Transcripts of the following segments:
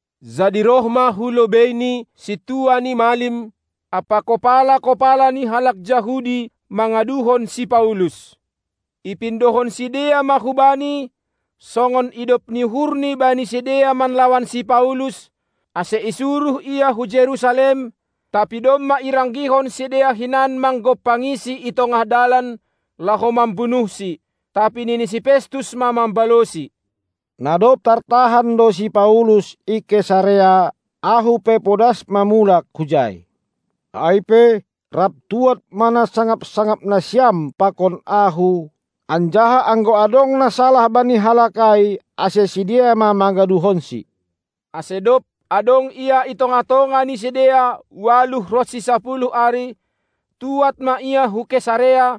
Jadi roh ma hu lobeini sintua ni malim ampa kopala-kopala ni halak Jahudi mangaduhon si Paulus. Ipindohon sidea ma hubani, songon idop ni uhurni bani sidea manlawan si Paulus, ase isuruh ia hu Jerusalem, tapi domma iranggihon sidea hinan manggompangisi i tongah dalan, laho mambunuhsi. Tapi nini si Festus ma mambalosi: Na dob tartahan do si Paulus i Kesarea, ahu pe podas ma mulak hujai. Ai pe, rap tuad ma na sangap-sangap nasiam pakon ahu, anjaha anggo adong na salah bani halak ai, ase sidea ma mangaduhonsi. Ase dob adong ia i tongah-tongah ni sidea ualuh ronsi sapuluh ari, tuad ma ia hu Kesarea;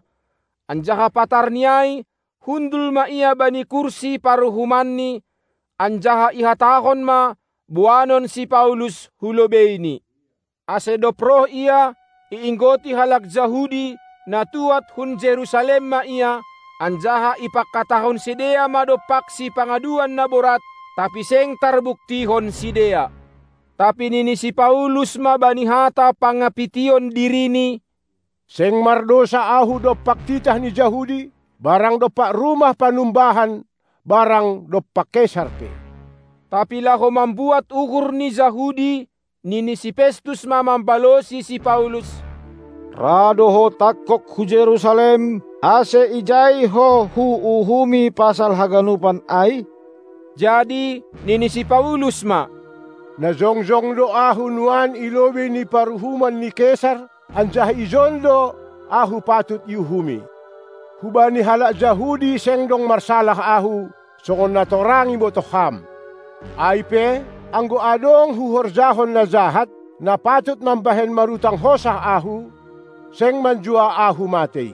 anjaha patarni ai hundul ma ia bani kursi paruhumanni, anjaha ihatahon ma boanon si Paulus hu lobeini. Ase dob roh ia, iinggoti halak Jahudi, na tuad hun Jerusalem ma ia, anjaha ipangkatahon sidea ma dompaksi pangaduan na borat, tapi seng tarbuktihon sidea. Tapi nini si Paulus ma bani hata pangapition dirini: Seng mardousa ahu dompak titah ni Jahudi, barang dompak rumah panumbahan barang dompak Kesar pe. Tapi laho mambuat uhur ni Jahudi, nini si Festus ma mambalosi si Paulus: Ra do ho tangkog hu Jerusalem, ase ijai ho huuhumi pasal haganupan ai? Jadi nini si Paulus ma: Na jongjong do ahu nuan i lobei ni paruhuman ni Kesar, anjaha ijon do ahu patut iuhumi. Hubani halak Jahudi seng dong marsalah ahu, songon na torang ibotoh ham. Ai pe, anggo adong huhorjahon na jahat, na patut mambahen marutang hosah ahu, seng manjua ahu matei;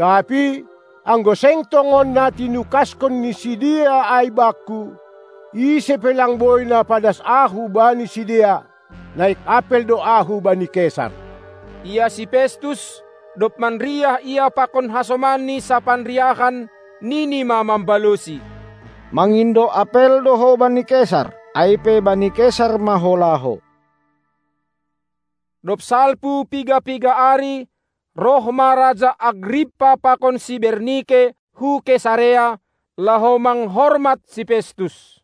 tapi anggo seng tongon na tinukaskon ni sidea ai bakku, ise pe lang boi na padas ahu bani sidea. Naik apel do ahu bani Kesar. Ia si Festus, dob manriah ia pakon hasomanni sapanriahan, nini ma mambalosi: Mangindo apel do ho bani Kesar, ai pe bani Kesar ma ho laho! Dob salpu piga-piga ari roh ma raja Agrippa pakon si Bernike hu Kesarea, laho manghormat si Festus.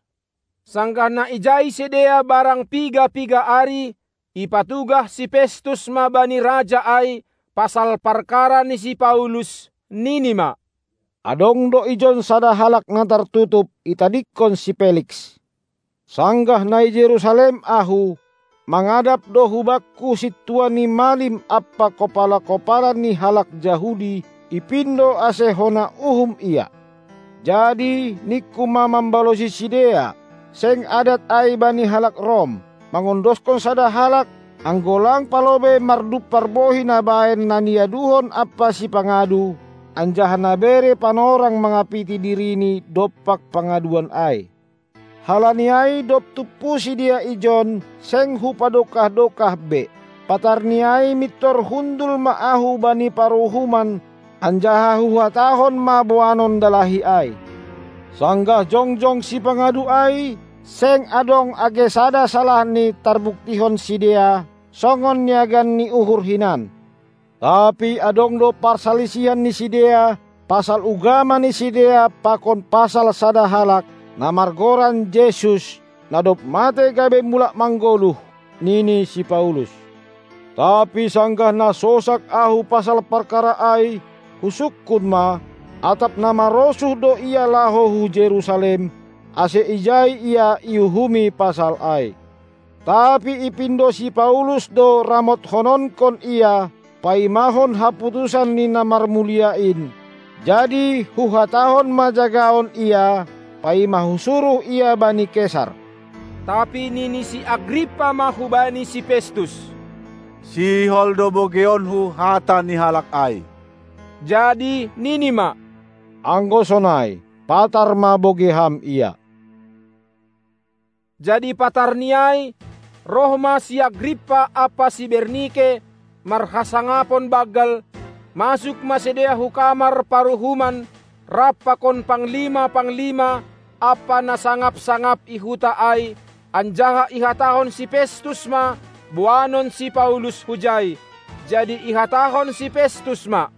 Sanggah na ijai sidea barang piga-piga ari, ipatugah si Festus ma bani raja ai pasal parkara ni si Paulus, nini ma: Adong do ijon sada halak na tartutup, itadingkon si Feliks. Sanggah na i Jerusalem ahu, mangadap do hubakku sintua ni malim ampa kopala-kopala ni halak Jahudi, ipindo ase hona uhum ia. Jadi ningku ma mambalosi sidea: Seng adat ai bani halak Rom mangondoskon sada halak, anggo lang palobei mardumpar bohi nabahen na niaduhon ampa sipangadu, anjaha nabere panorang mangapiti dirini dompak pangaduan ai. Halani ai dob tumpu sidea ijon, seng hupadokah-dokah be; patarni ai mintor hundul ma ahu bani paruhuman, anjaha huhatahon ma boanon dalahi ai. Sanggah jongjong sipangadu ai, seng adong age sada salahni tarbuktihon sidea, songon niagan ni uhur hinan. Tapi adong do parsalisihan ni sidea pasal ugama ni sidea pakon pasal sada halak, na margoran Jesus, na dob matei gabe mulak manggoluh, nini si Paulus. Tapi sanggah na sosak ahu pasal parkara ai, husungkun ma, atap na marosuh do ia laho hu Jerusalem, ase ijai ia iuhumi pasal ai. Tapi ipindo si Paulus do ramotkononkon ia, paimahon haputusan ni na marmulia in; jadi huhatahon ma jagaon ia, paima husuruh ia bani Kesar. Tapi nini si Agrippa ma hubani si Festus: Sihol do bogeionku hata ni halak ai. Jadi nini ma: Anggo sonai, patar ma bogei ham ia! Jadi patarni ai, roh ma si Agrippa ampa si Bernike marhasangapon banggal, masuk ma sidea hu kamar paruhuman rap pakon panglima-panglima ampa na sangap-sangap i huta ai, anjaha ihatahon si Festus ma boanon si Paulus hujai. Jadi ihatahon si Festus ma: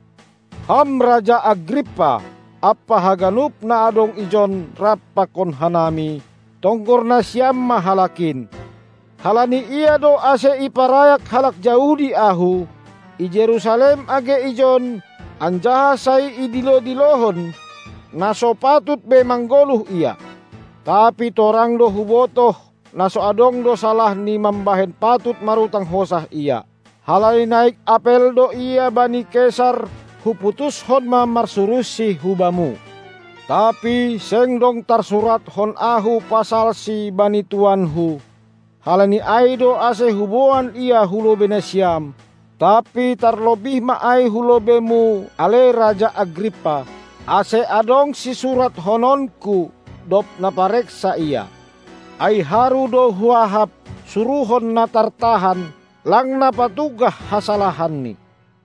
Ham raja Agrippa ampa haganup na adong ijon rap pakon hanami, tonggor nasiam ma halak in! Halani ia do ase iparayak halak Jahudi ahu, i Jerusalem age ijon, anjaha sai idilo-dilohon, na so patut be manggoluh ia. Tapi torang do hubotoh na so adong do salahni mambahen patut marutang hosah ia. Halani naik apel do ia bani Kesar huputushon ma marsuruhsi hubamu. Tapi seng dong tarsuratkon ahu pasalsi bani tuanku; halani ai do ase huboan ia hu lobei nasiam, tapi tarlobih ma ai hu lobeimu, ale raja Agrippa, ase adong sisurathononku, dob napareksa ia. Ai haru do huahap, suruhon na tartahan, lang napatugah hasalahanni.